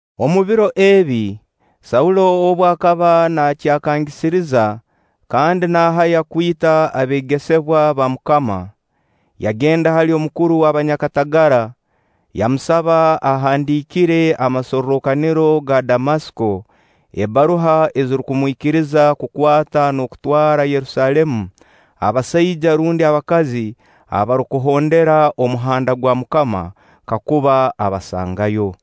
Omu biro ebi, Saulo obu akaba naakyakangisiriza kandi naahaya kwita abeegesebwa ba MUKAMA, yagenda hali omukuru w'abanyakatagara, yamusaba ahandiikire amasorrokaniro ga Damasiko ebbaruha ezirukumwikiriza kukwata n'okutwara Yerusaalemu abasaija rundi abakazi abarukuhondera Omuhanda gwa MUKAMA kakuba abasangayo.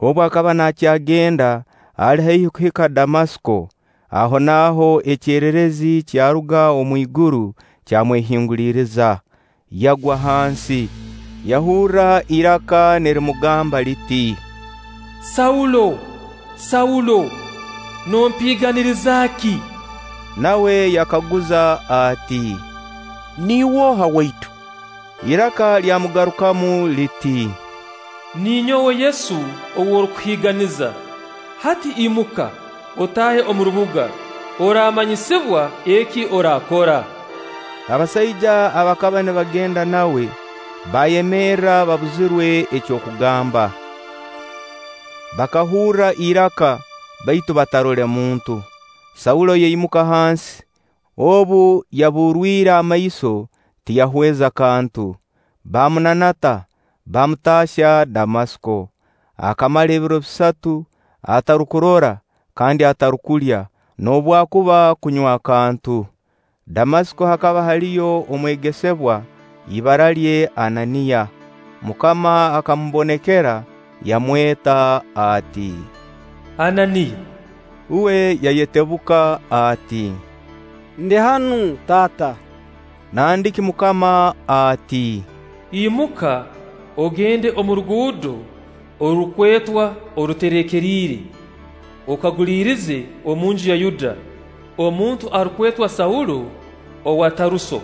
Obu akaba naakyagenda, ali haihi kuhika Damasiko, ahonaaho ekyererezi kyaruga omwiguru, kyamwehinguliriza. Yagwa hansi, yahurra iraka nirimugamba liti: “Saulo, Saulo, nompiiganiriza ki?” Nawe yakaguza ati; “Niiwe oha, Waitu?” Iraka lyamugarukamu liti: “Ninyowe Yesu ou orukuhiiganiza. Hati imuka, otaahe omu rubuga, oraamanyisibwa eki oraakora.” Abasaija abakaba nibagenda nawe baayemerra babuzirwe eky'okugamba. Bakahurra iraka, baitu batarole muntu. Saulo yaimuka hansi; obu yaburwire amaiso, tiyahweza kantu. Baamunanata, baamutaahya Damasiko. Akamara ebiro bisatu atarukurora kandi atarukulya noobwakuba kunywa kantu. Damasiko hakaba haliyo omwegesebwa, ibara lye Ananiya. MUKAMA akamubonekera yamweta ati: “Ananiya.” Uwe yayetebuka ati: “Ndi hanu, Taata.” Nandiki MUKAMA ati: “Imuka, ogende omu ruguudo orurukwetwa Oruterekeriire, okaguliirize omunju ya Yuda, omuntu arukwetwa Saulo owa Taruso.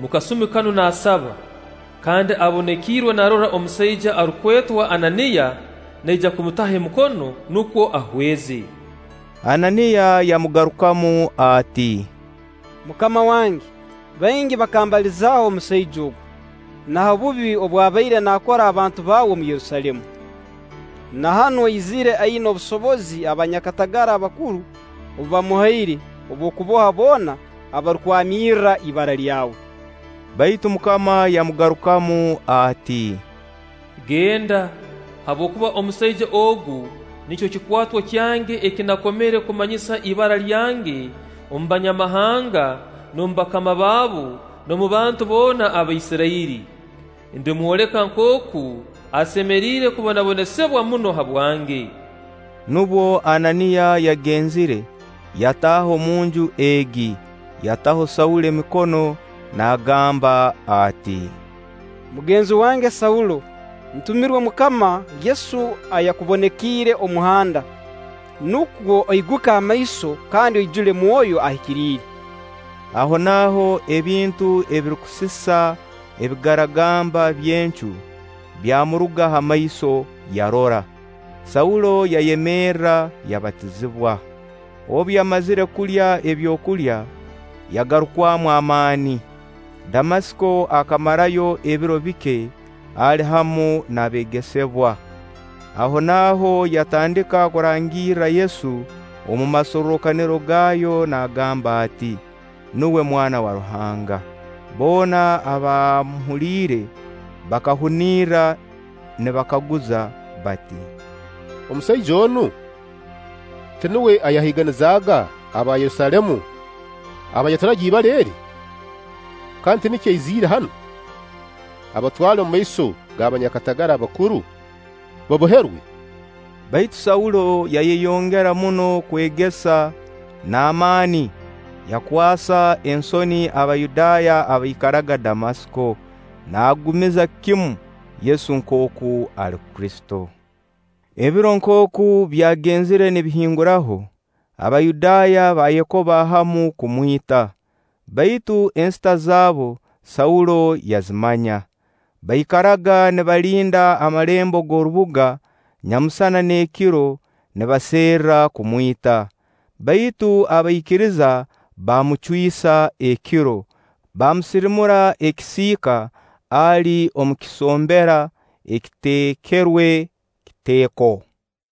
Mu kasumi kanu naasaba, kandi abonekiirwe naarora omusaija arukwetwa Ananiya naija kumutaho emikono nukwo ahweze.” Ananiya yamugarukamu ati: “MUKAMA wange, baingi bakambalizaaho omusaija ogu, na ha bubi obu abaire naakora abantu baawe omu Yerusaalemu. Na hanu aizire aina obusobozi abanyakatagara bakuru obu baamuhaire obw'okuboha boona abarukwamirra ibara lyawe.” Baitu MUKAMA yamugarukamu ati: “Genda, habwokuba omusaija ogu nikyo kikwato kyange eki nakomere kumanyisa ibara lyange omu Banyamahanga, n'omu bakama baabo, n'omu bantu boona aba Isirairi. Ndimwoleka nkooku asemeriire kubonabonesibwa muno habwange.” Nubwo Ananiya yagenzire, yataaha omunju egi. Yataho Saulo emikono naagamba ati: “Mugenzi wange Saulo, ntumirwe MUKAMA Yesu ayakubonekiire omu muhanda, nukwo oiguke amaiso kandi oijule Mwoyo Ahikiriire.” Ahonaaho ebintu ebirukusisa ebigaragamba by'encu byamuruga ha maiso, yarora. Saulo yayemerra, yabatizibwa. Obu yamazire kulya ebyokulya, yagarukwamu amaani. Damasiko akamarayo ebiro bike, ali hamu n'abeegesebwa. Ahonaaho yatandika kurangirra Yesu omu masorrokaniro gaayo naagamba ati: “Nuwe Mwana wa Ruhanga.” Boona abaamuhuliire bakahunirra nibakaguza bati: “Omusaija onu, tinuwe ayahiiganizaaga aba Yerusaalemu abaayaturaga ibara eri? Kandi tinikyo aiziriire hanu, abatwale omu maiso g'abanyakatagara abakuru baboherwe?” Baitu Saulo yayeyongera muno kwegesa n'amaani yakwasa ensoni Abayudaaya abaikaraga Damasiko, naagumiza kimu Yesu nkooku ali Kristo. Ebiro nkooku byagenzire nibihinguraho, Abayudaaya baayekoba hamu kumwita; baitu ensita zaabu Saulo yazimanya. Baikaraga nibalinda amalembo g'orubuga nyamusana n'ekiro nibaserra kumwita. Baitu abaikiriza baamucwisa ekiro, baamusirimura ekisiika ali omu kisombera ekiteekerwe kiteeko.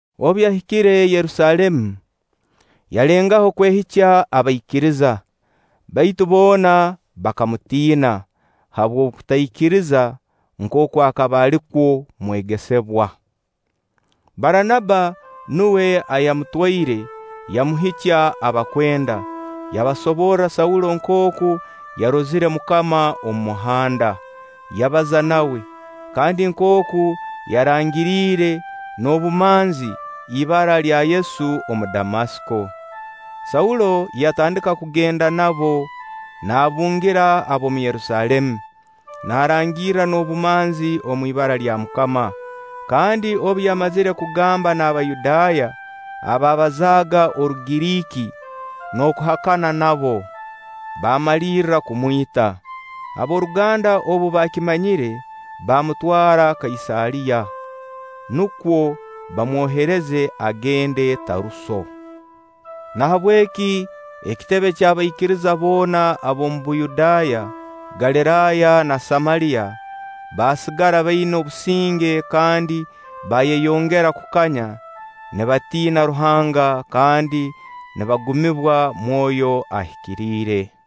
Obu yahikire Yerusaalemu, yalengaho kwehikya abaikiriza; baitu boona bakamutiina, habw'okutaikiriza nkooku akaba ali kwo mwegesebwa. Baranaba nuwe ayamutwaire, yamuhikya abakwenda, yabasoborra Saulo nkooku yarozire MUKAMA omu muhanda, yabaza nawe, kandi nkooku yarangiriire n'obumanzi ibara lya Yesu omu Damasiko Saulo yatandika kugenda nabo, naabungira ab'omu Yerusaalemu, naarangirra n'obumanzi omwibara lya MUKAMA. Kandi obu yamazire kugamba n'Abayudaaya abaabazaaga Orugiriiki n'okuhakaniza nabo, baamalirra kumwita. Ab'oruganda obu baakimanyire, baamutwara Kaisaariya, nukwo baamwohereza agende Taruso. Nahabweki ekitebe ky'abaikiriza boona ab'omu Buyudaaya, Galiraaya, na Samaliya baasigara baina obusinge kandi baayeyongera kukanya nibatiina Ruhanga kandi nibagumibwa Mwoyo Ahikiriire.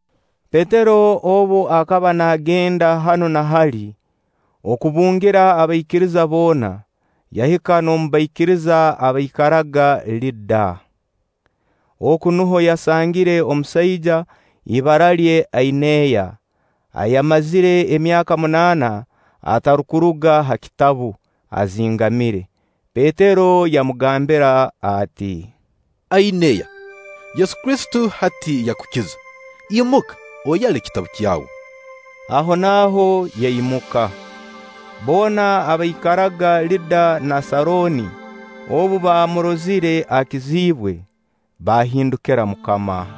Petero obu akaba naagenda hanu na hali okubungira abaikiriza boona, yahika n'omu baikiriza abaikaraga Liida. Oku nuho yasangire omusaija, ibara lye Aineya, ayamazire emyaka munaana atarukuruga ha kitabu, azingamire. Petero yamugambira ati: “Aineya, Yesu Kristo hati yakukiza; imuka oyale ekitabu kyawe.” Ahonaaho yaimuka. Boona abaikaraga Liida na Sarooni obu baamurozire akizibwe, baahindukira MUKAMA.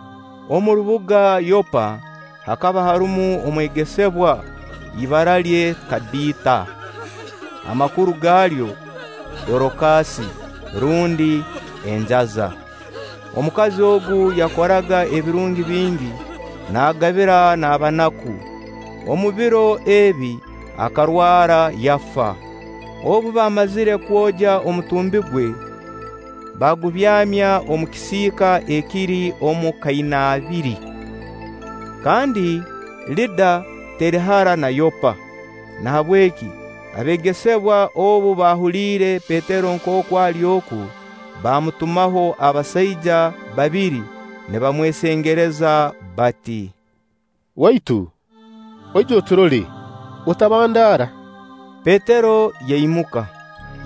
Omu rubuga Yoppa hakaba harumu omwegesebwa, ibara lye Tabita, amakuru gaalyo: Dorokasi rundi Enjaza. Omukazi ogu yakoraga ebirungi bingi naagabira n'abanaku. Omu biro ebi akarwara, yafa. Obu baamazire kwogya omutumbi gwe, baagubyamya omu kisiika ekiri omu kainaabiri. Kandi Liida teri hara na Yoppa. Nahabweki abeegesebwa obu baahuliire Petero nkooku ali oku, baamutumaho abasaija babiri nibamwesengereza bati; “Waitu oije oturole, otabandaara.” Petero yaimuka,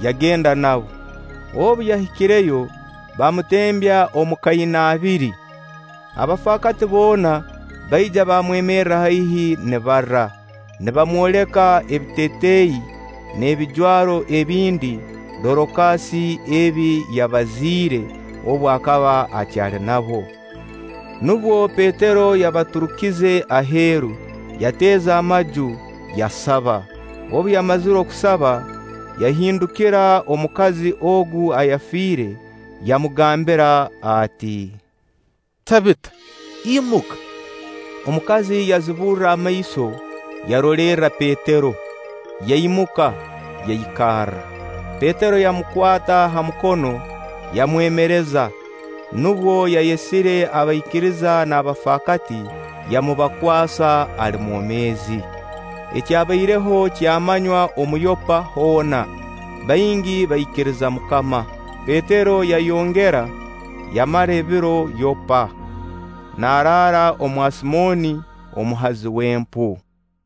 yagenda nabo. Obu yahikireyo, baamutembya omu kainaabiri. Abafaakati boona baija bamwemerra haihi nibarra, nibamwoleka ebitetei n'ebijwaro ebindi Dorokasi ebi yabaziire obu akaba akyali nabo. Nubwo Petero yabaturukize aheeru, yateza amaju, yasaba. Obu yamazire kusaba, yahindukira omukazi ogu ayafiire, yamugambira ati: “Tabita, imuka.” Omukazi yaziburra amaiso, yarolerra Petero, yaimuka, yaikarra. Petero yamukwata ha mukono, yamwemereza. Nubwo yayesire abaikiriza n'abafakaati, yamubakwasa ali mwomeezi. Ekyabaireho kyamanywa omu Yoppa hoona; baingi baikiriza MUKAMA. Petero yayongera yamara ebiro Yoppa, naaraara omwa Simooni, omuhazi w'empu.